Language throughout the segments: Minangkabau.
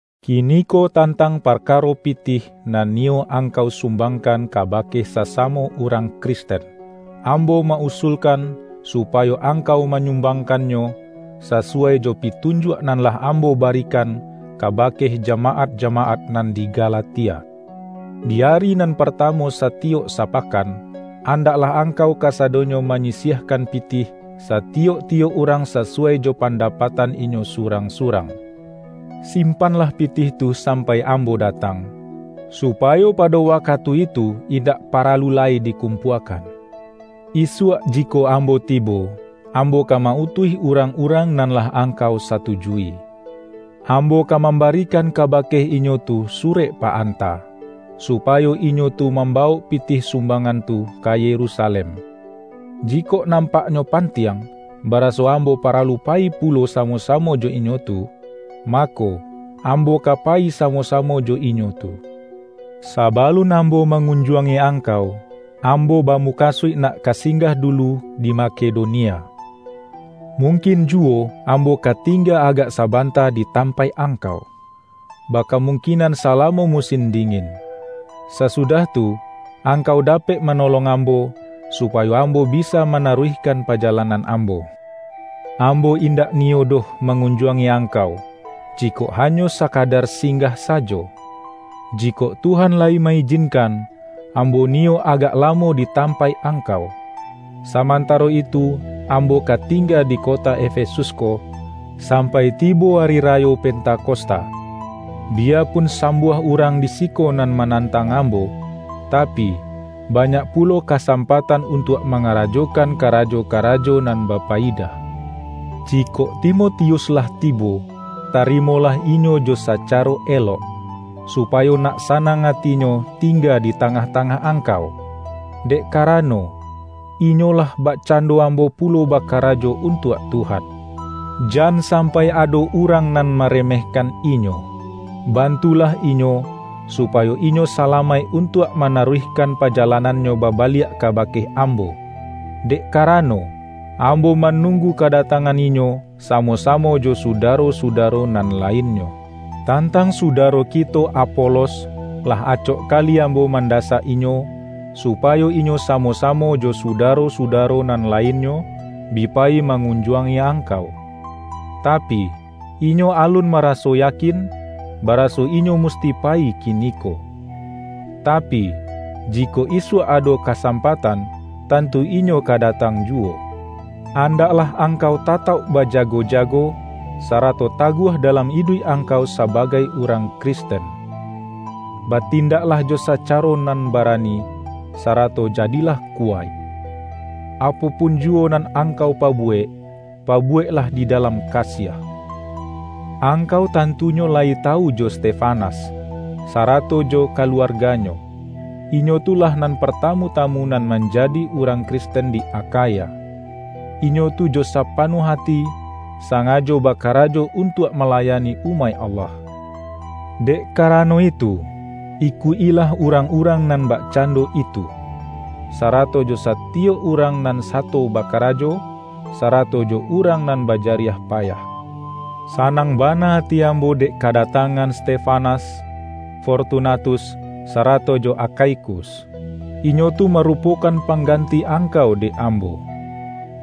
Kiniko tantang parkaro pi-tih nan niyo angkau sum-bangkan kabake sasamo urang Kris-ten, ambo ma-usulkan supayo angkau manyumbangkannyo, sasuwai jo pi-tunjuak nan lah ambo barikan kaba-ke jamaat-jamaat nan di Galatia. Di ari nan partamu satiyok sapakan, an-daklah angkau kasadonyo manyisiah-kan pitih, satiyok-tiyok urang sasuwai jo pandapatan inyo surang-surang. Simpanlah pitih tu sampai ambo da-tang, supayo pado wakatu itu indak paralu lai dikumpuakan. Isuak jikok ambo tibo, ambo ka ma-utuih urang-urang nan lah angkau satujui. Ambo ka mambarikan kabake inyo tu su-rek pa-anta, supayo inyo tu mamba-wok pitih sumbangan tu ka Yerusalem. Jikok nampaknyo pantiang, baraso ambo paralu payi pulo samo-samo jo inyo tu, mako, ambo ka payi samo-samo jo inyo tu. Sabalun ambo mangunjuangi ang-kau, ambo bamukasuik nak ka sing-gah dulu di Makedonia. Mungkin juwo ambo ka tingga agak sabanta di tampaik angkau, bakamungkin-an salamo musin dingin. Sasudah tu, angkau dapek manolong ambo, su-payo ambo bisa manaruihkan paja-lanan ambo. Ambo indak niyo doh mangunjuangi angkau, jikok hanyo sa-kadar singgah sajo. Jikok Tuhan layi ma-ijinkan, ambo niyo agak lamo di tampaik angkau. Samantaro itu ambo ka tingga di kota Efesus ko, sampai tibo ari rayo Pentakosta. Biyapun sambuah urang di siko nan manantang ambo, tapi, banyak pulo kasampatan untuak mangarajokan karajo-karajo nan ba-payidah. Jikok Timotius lah tibo, tarimo-lah inyo jo sacaro elok, supayo nak sa-nang atinyo tingga di tangah-tangah angkau, dek karano, inyo lah bakcan-do ambo pulo bakarajo untuak Tuhan. Jan sampai ado urang nan mare-mehkan inyo. Bantulah inyo, supayo inyo salamaik untuak manaruihkan pajalanannyo babaliak kabake am-bo, dek karano, ambo manunggu ka-datangan inyo, samo-samo jo sudaro-sudaro nan lainnyo. Tantang sudaro kito Apolos, lah acok kali ambo mandasak inyo, supa-yo inyo samo-samo jo sudaro-sudaro nan lainnyo, bi payi mangunjuangi angkau. Tapi, inyo alun maraso ya-kin, baraso inyo musti payi kiniko. Ta-pi, jikok isuak ado kasampatan, tantu inyo ka datang juwo. Andaklah angkau tatauk baja-go-jago, sarato taguah dalam iduik angkau sabagai urang Kristen. Batin-daklah jo sacaro nan barani, sarato jadilah kuwaik. Apo pun juwo nan angkau pabuwek, pabuweklah di da-lam kasiah. Angkau tantunyo layi tawu jo Stefanas, sarato jo kaluarganyo; inyo tu lah nan partamu-tamu nan manja-di urang Kristen di Akhaya. Inyo tu jo sapanuah ati, sangajo bakarajo untuak malayani umaik Allah. Dek karano itu, ikuik-ilah urang-urang nan bakcando itu, sarato jo satiyok urang nan sato bakarajo, sarato jo urang nan ba-jariah payah. Sanang bana ati ambo dek kada-tangan Stefanas, Fortunatus, sarato jo Akhaikus. Inyo tu marupokan pang-ganti angkau dek ambo.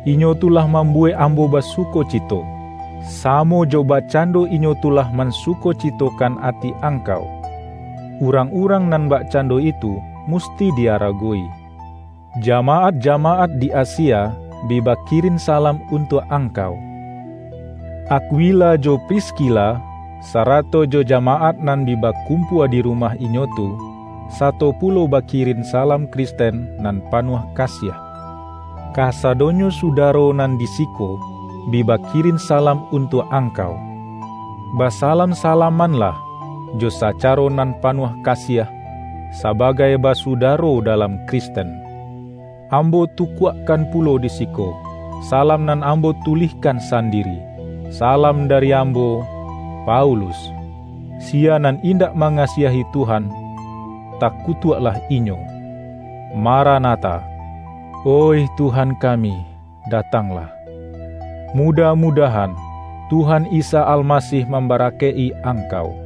Inyo tu lah mambuwek ambo basukocito, samo jo bakcando inyo tu lah mansukocitokan ati angkau. Urang-urang nan bakcan-do itu musti di-aragowi. Jamaat-jamaat di Asia, bi bakirin salam untuak angkau. Akwila jo Pris-kila, sarato jo jamaat nan bi bakum-pua di rumah inyo tu, sato pulo baki-rin salam Kristen nan panuah kasiah. Kasadonyo sudaro nan di siko, bi bakirin salam untuak angkau. Basalam-salamanlah, jo sacaro nan panuah kasiah, sabagai basudaro da-lam Kristen. Ambo tukuakkan pulo di siko, sa-lam nan ambo tulihkan sandiri: Salam dari ambo, Paulus. Siya nan indak mangasiahi Tuhan, takutuaklah inyo! Maranatha - oih Tuhan kami, datanglah! Mudah-mudahan, Tuhan Isa Almasih mambarakaik-i angkau.